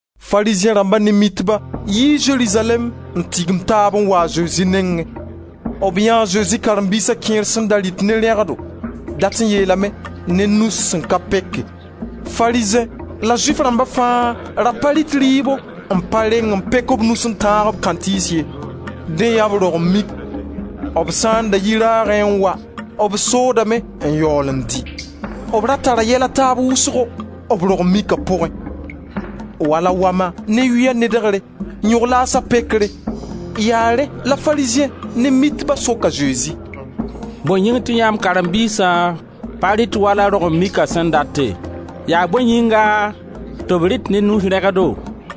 Farizẽ rãmba ne Mitba yii Zerizalɛɛm n tigim taab n wa a Zezi nengẽ. B yãe e Zezi karen-biisa kẽer sẽn da rɩt ne rẽgdo, dat n yeelame: ne nus sẽn ka peke. Farizẽ la Zʋɩf rãmba fãa da pa rɩt rɩɩbo n pa reng n pek b nus n tãag kãntɩɩs ye. Dẽ yaa b rog-n-mik. B sã n da yi raagẽ n wa b soodame n yaool n dɩ. B ra tara yɛl a taab wʋsgo, b rog-n-mika pʋgẽ, wala wama ne yʋya nedegre, yõg-laasa pekre. Yaa rẽ la Farizẽ ne mitba sok a Zezi: «Bõe yĩng tɩ yãmb karen-biisã pa rɩt wala rog-n-mika sẽn date? Yaa bõe yĩnga tɩ b rɩt ne nus rẽgdo?»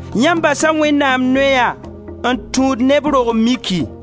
Yãmb basa Wẽnnaam noya n tũud neb rog-n-miki.»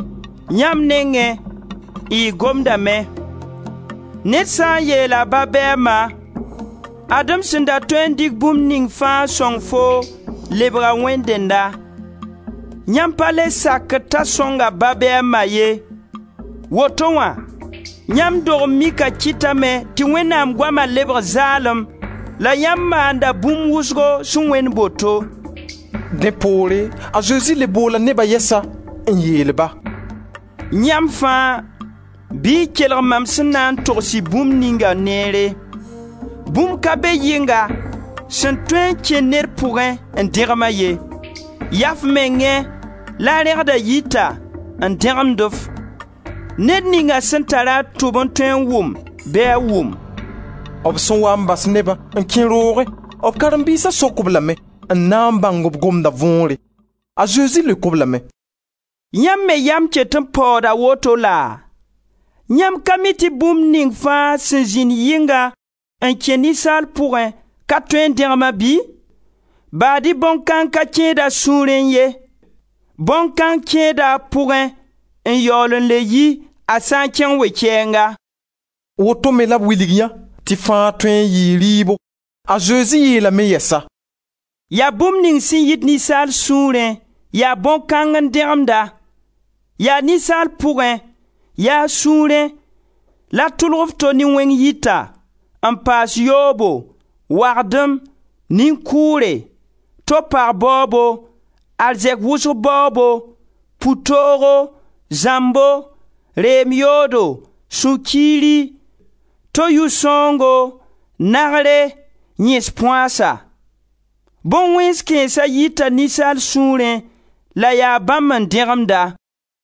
Yãmb nengẽ y gomdame: ‹Ned sã n yeel a ba bɩ a ma: ad-m sẽn da tõe n dɩk bũmb ning fãa n sõng foo lebga Wẽnd dẽnna›, yãmb pa le sakd t'a sõng a ba bɩ a ma ye. Woto wã, yãmb dog-n-mika kɩtame tɩ Wẽnnaam goama lebg zaalem la yãmb maanda bũmb wʋsgo sẽn wẽnd boto.» Dẽ poore, a Zezi le boola neba yɛsa n yeel-ba: «Yãmb fãa, bɩ y kelg mam sẽn na n togs-y bũmb ninga neere. Bũmb ka be yɩnga sẽn tõe n kẽ ned pʋgẽ n dẽgem-a ye. Yaa f mengẽ la rẽgda yita n dẽgemd-f. [ Ned ninga sẽn tar-a tʋb n tõe n wʋm bɩ a wʋm!»] B sẽn waa n bas nebã n kẽ roogẽ, b karen-biisa sok-b lame n na n bãng b gomda võore. A Zezi leok-b lame: «Yãmb me yam ket n paooda woto laa? Yãmb ka mi tɩ bũmb ning fãa sẽn zĩnd yɩnga n kẽ ninsaal pʋgẽ ka tõe n dẽgem-a bɩ? Baad-y bõn-kãng ka kẽed a sũurẽ ye. Bõn-kãng kẽeda a pʋgẽ n yaool n le yi a sã n kẽng we-kɛɛnga.» Woto me la b wilg yã tɩ fãa tõe n yɩɩ rɩɩbo. A Zezi yeelame yɛsa: «Ya bũmb ning sẽn yit ninsaal sũurẽ, yaa bõn-kãng n dẽgemd-a. Yaa ninsaal pʋgẽ, yaa a sũurẽ la tʋlg f to ne wẽng yita, n paas yoobo, wagdem, nin-kʋʋre, to pag baoobo, arzɛk wʋsg baoobo, pu-toogo, zãmbo, reem yoodo, sũ-kiiri, to yʋ sãoongo, nagre, yẽs-põasa. Bõn-wẽens kãensã yita ninsaal sũurẽ la yaa bãmb n dẽgemd-a.»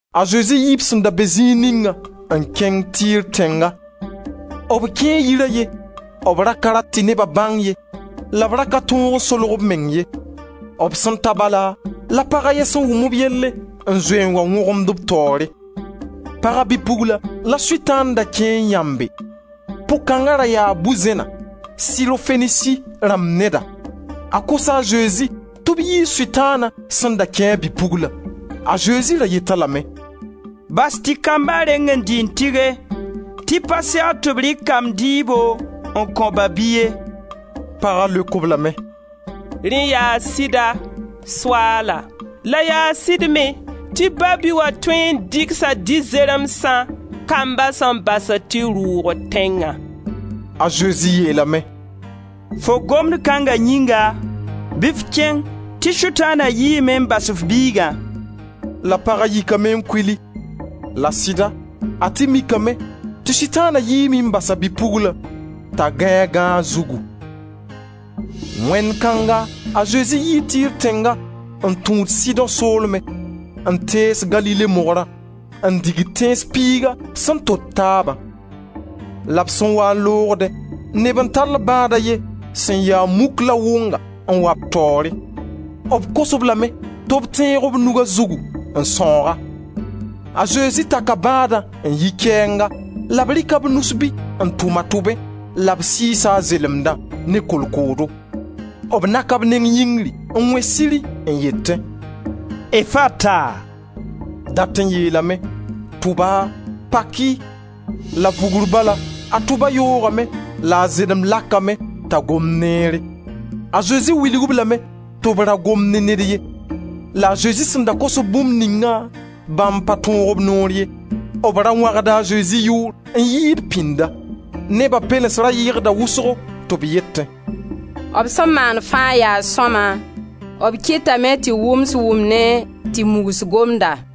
A Zezi yii b sẽn da be zĩig ningã n kẽng Tir tẽnga. B kẽe yir a ye; b ra ka rat tɩ neba bãng ye la b ka tõog n solg b meng ye. B sẽn ta bala, la pag a ye sẽn wʋm b yelle n zoe n wa wõgemd b taoore. Paga bi-pugla la Sʋtãan da kẽ n yãmbe. Pʋg-kãng ra yaa bu-zẽna, Sirofenisi rãmb neda. A kosa a Zezi tɩ b yiis Sʋtãana sẽn da kẽ a bi-puglã. A Zezi ra yet-a lame: «Bas tɩ kamba reng n dɩ n tɩge, tɩ pa segd tɩ b rɩk kamb dɩɩbo n kõ ba-bi ye.» Paga leok-b lame: «Rẽ yaa sɩda, Soaala, la yaa sɩd me tɩ ba-bi wã tõe n dɩgsa dɩ-zeremsã kamba sẽn basd tɩ rʋʋgd tẽngã.» A Zezi yeel-a lame: «Fo gomd kãnga yĩnga bɩ f kẽng tɩ Sʋtãana yiime n bas f biigã.» La paga yikame n kuli, la sɩda, a tɩ mikame tɩ Sʋtãana yiime n bas a bi-pugla t'a gãe a gãag zugu. Wẽnd kãnga, a Zezi yii Tir tẽnga n tũud Sidõ soolme, n tees Galile Mogrã, n digd Tẽns piiga sẽn tot taabã. La b sẽn waa n loogdẽ, neb n tall bãad a ye sẽn ya muk la wʋnga n wa b taoore. B kos-b lame tɩ b tẽeg b nug a zugu n sãoog-a. A Zezi taka bãadã n yi kɛɛnga la b rɩka b nus-bi n tʋm a tʋbẽ la b sɩɩs a zelemdã ne kolkoodo. B naka b neng yĩngri n wẽ siri n yetẽ: «Efata» dat n yeelame: tʋba, pak-y. La vugr bala a tʋba yoogame la a zelemd lakame t'a gomd neere. A Zezi wilg-b lame tɩ b ra gom ne ned ye; la a Zezi sẽn da kos-b bũmb ningã, bãmb pa tõog b noor ye; b da wãgda a Zezi yʋʋr n yɩɩd pĩnda. Neba pɛlens ra yɩgda wʋsgo tɩ b yetẽ: «B sẽn maan fãa yaa sõma: b kɩtame tɩ wʋms wʋmnẽ, tɩ mugs gomda.»